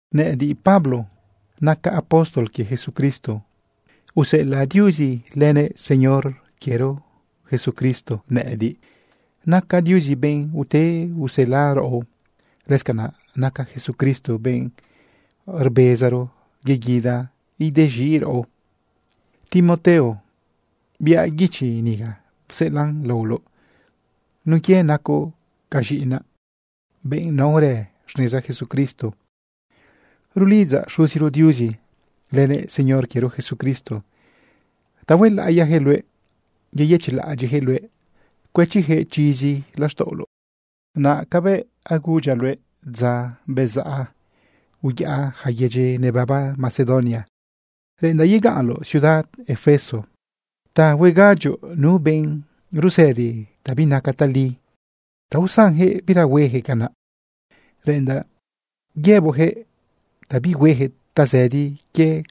Nëꞌëdiꞌ, Pablo, nacaꞌ apóstol quie Jesucristo. Useꞌelaꞌ Diuzi lënëꞌ Señor quiero Jesucristo nëꞌëdiꞌ. Naca Diuzi benꞌ ute usela raꞌo. Lëscanaꞌ naca Jesucristo benꞌ rbezaro yeguida idez̃iꞌ raꞌo. Timoteo, biaꞌ guichi niga pseꞌelaꞌn laoloꞌ nun quie nacoꞌ ca z̃iꞌinaꞌ, benꞌ naorë xneza Jesucristo. Rulidzaꞌ Xuziro Diuzi lënëꞌ Señor quiero Jesucristo ta huelaꞌiyaquëꞌ luëꞌ, yeyëchiꞌlaꞌadyiꞌyaquëꞌ luëꞌ, cuëchiyaquëꞌ chizi laxtaꞌoloꞌ. Como cabëꞌ agudyaꞌ luëꞌ dza bezaꞌ uyaꞌa yaca yedyi nebaba Macedonia, reꞌendaꞌ yegaꞌnloꞌ ciudad Efeso ta huegadyoꞌ nu benꞌ rusëdi ta binaca tali ta usanjëꞌ bira huejëꞌ canaꞌ. Reꞌendaꞌ yëboꞌyaquëꞌ ta bihuejëꞌ tazëdi quie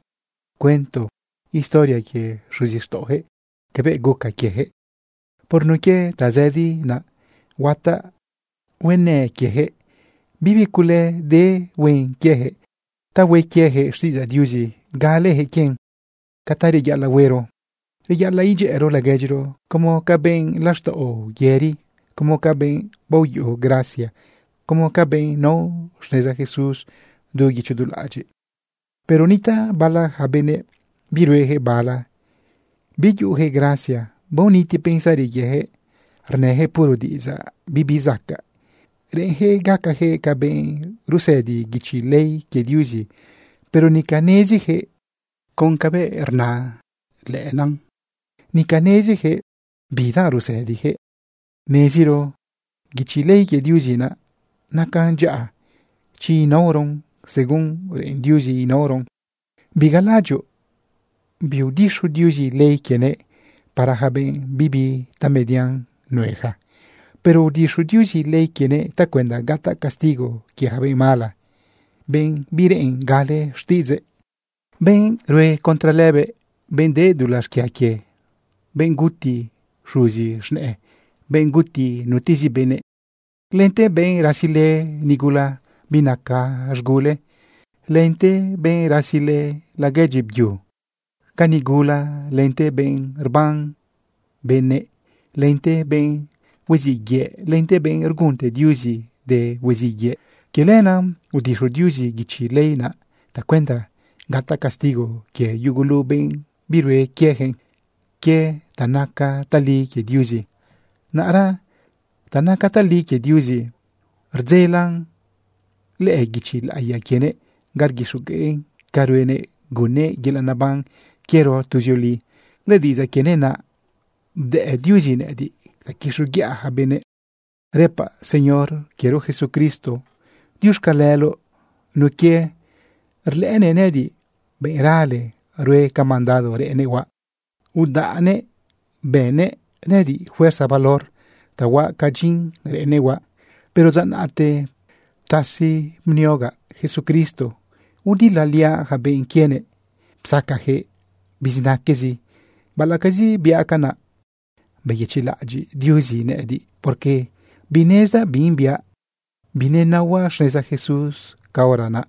cuento historia quie xuzixtaꞌoyaquëꞌ cabëꞌ guca quieyaquëꞌ. Por nun quie tazëdi naꞌ, huataꞌ huenë quieyaquëꞌ, bibi cule de huen quieyaquëꞌ ta hue quieyaquëꞌ xtiꞌidzaꞌ Diuzi galeyaquëꞌ quien. Ca ta reyaꞌalaꞌ huero, reyaꞌalaꞌ idyëꞌëro laguedyiro como ca benꞌ laxtaꞌo yëri, como ca benꞌ baoyuꞌu gracia, como ca benꞌ nao xneza Jesús du guicho du laꞌadyiꞌ. Pero nitaꞌ bala yaca benëꞌ birueyaquëꞌ bala. Biyuꞌuyaquëꞌ gracia, baoniti pensari quieyaquëꞌ, rnëjëꞌ puro diꞌidzaꞌ bibi zacaꞌ. Reꞌenyaquëꞌ gacayaquëꞌ ca benꞌ rusëdi guichi ley quie Diuzi, pero nica neziyaquëꞌ con cabëꞌ rnan lëꞌëna nica neziyaquëꞌ bidanꞌ rusëdiyaquëꞌ. Neziro guichi ley quie Diuzi naꞌ nacan dyaꞌa chi inaoron según reꞌen Diuzi inaoron. Bigalaꞌadyoꞌ biudixu Diuzi ley quienëꞌ para yaca benꞌ bibi tamedian nueja. Pero udixo Diuzi ley quienëꞌ tacuenda gataꞌ castigo quie yaca benꞌ mala, benꞌ bireꞌen gale xtiꞌidzëꞌ, benꞌ rue contra lëbëꞌ, benꞌ de dulaꞌ xquia quie, benꞌ guti xuzi z̃nëꞌë, benꞌ guti nutezi benëꞌ, lente benꞌ rasilë nigula binaca z̃gule, lente benꞌ rasilë laguedyi byunëꞌ ca nigula, lente benꞌ rban benëꞌ, lente benꞌ huiziꞌ yëꞌ, lente benꞌ rgunte Diuzi de huiziꞌ yëꞌ. Quie lenaꞌ udixo Diuzi guichi ley naꞌ tacuenda gataꞌ castigo quie yugulu benꞌ birue quiejëꞌ quie ta naca tali quie Diuzi. Naꞌra ta naca tali quie Diuzi rdzelan lëꞌë guichi laꞌiya quienëꞌ ga rguixogueꞌn ca ruenëꞌ gunnëꞌ yelaꞌ neban quiero tuzioli. Lëdiꞌidzaꞌ quienëꞌ naꞌ bdëꞌ Diuzi nëꞌëdiꞌ ta quixoguiꞌa yaca benëꞌ. Rëpaꞌ Señor quiero Jesucristo diuxcaleloꞌ nun quie rlëꞌënëꞌ nëꞌëdiꞌ benꞌ rale rue ca mandado reꞌennëꞌ huaꞌ, udaꞌnëꞌ bënnëꞌ nëꞌëdiꞌ fuerza valor ta huaꞌ ca dyin reꞌennëꞌ huaꞌ. Pero dza naꞌte ptasi bniogaꞌ Jesucristo, udilaliaꞌ yaca benꞌ quienëꞌ, psacayaquëꞌ bizinaquezi. Baꞌalaꞌcazi biaꞌ canaꞌ, beyëchiꞌlaꞌadyiꞌ Diuzi nëꞌëdiꞌ, porque binezdaꞌ bin biaꞌ, binenaohuaꞌ xneza Jesús caora naꞌ.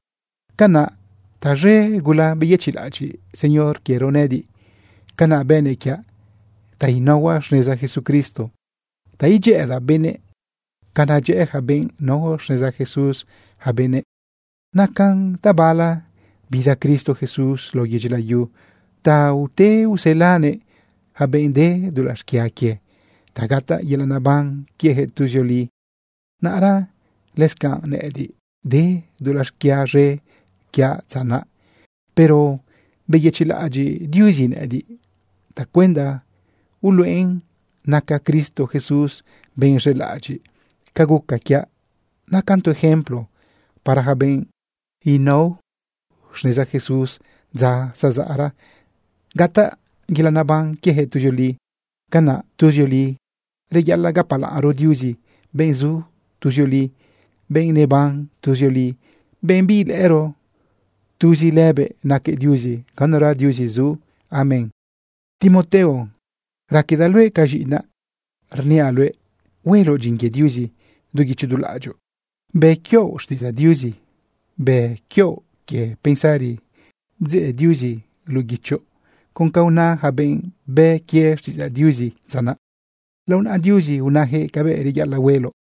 Canaꞌ taz̃e gula beyëchiꞌlaꞌadyiꞌ Señor quiero nëꞌëdiꞌ. Canaꞌ bënëꞌ quiaꞌ ta inaohuaꞌ xneza Jesucristo, ta idyëꞌëdaꞌ benëꞌ ca nadyëꞌë yaca benꞌ nao xneza Jesús yaca benëꞌ. Nacan tabala bida Cristo Jesús lao yedyi layu ta ute uselanëꞌ yaca benꞌ de dulaꞌ xquia quie ta gataꞌ yelaꞌ neban quieyaquëꞌ tuzioli. Naꞌra lëscanꞌ nëꞌëdiꞌ, de dulaꞌ xquia z̃e quiaꞌ dza naꞌ, pero beyëchiꞌlaꞌadyiꞌ Diuzi nëꞌëdiꞌ tacuenda uluꞌen naca Cristo Jesús benꞌ z̃elaꞌadyiꞌ. Ca guca quiaꞌ nacan tu ejemplo para yaca benꞌ huanao xneza Jesús dza zazaꞌra gataꞌ yelaꞌ neban quieyaquëꞌ tuzioli. Canaꞌ tuzioli reyaꞌalaꞌ gapalaꞌnro Diuzi, benꞌ zu tuzioli, benꞌ neban tuzioli, benꞌ biilëꞌëro. Tuzi lëbëꞌ naquëꞌ Diuzi, ganura Diuzi zu. Amén. Timoteo, raquedaꞌ luëꞌ ca z̃iꞌinaꞌ, rniaꞌ luëꞌ hueloꞌ dyin quie Diuzi du guicho du laꞌadyoꞌ, bë quioꞌ xtiꞌidzaꞌ Diuzi, bë quioꞌ quie pensari bdzeꞌ Diuzi luꞌu guichoꞌ con ca una yaca benꞌ bë quie xtiꞌidzaꞌ Diuzi dza naꞌ. Lao naꞌa Diuzi unayaquëꞌ cabëꞌ reyaꞌalaꞌ hueloꞌ.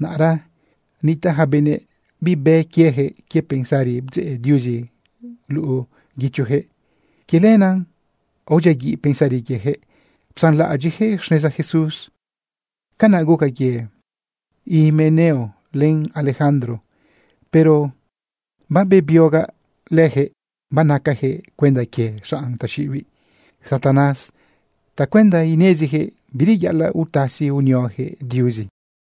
Naꞌra nitaꞌ yaca benëꞌ bibë quiejëꞌ quie pensari bdzeꞌ Diuzi luꞌu guichoyaquëꞌ. Quie lenaꞌ aodyiaguiꞌ pensari quieyaquëꞌ psanlaꞌadyiꞌyaquëꞌ xneza Jesús. Canaꞌ guca quie Himeneo len Alejandro. Pero babebiogaꞌ lëjëꞌ, banacayaquëꞌ cuenda quie xanꞌ taxiꞌibiꞌ Satanás tacuenda ineziyaquëꞌ bireyaꞌalaꞌ utasi unioyaquëꞌ Diuzi.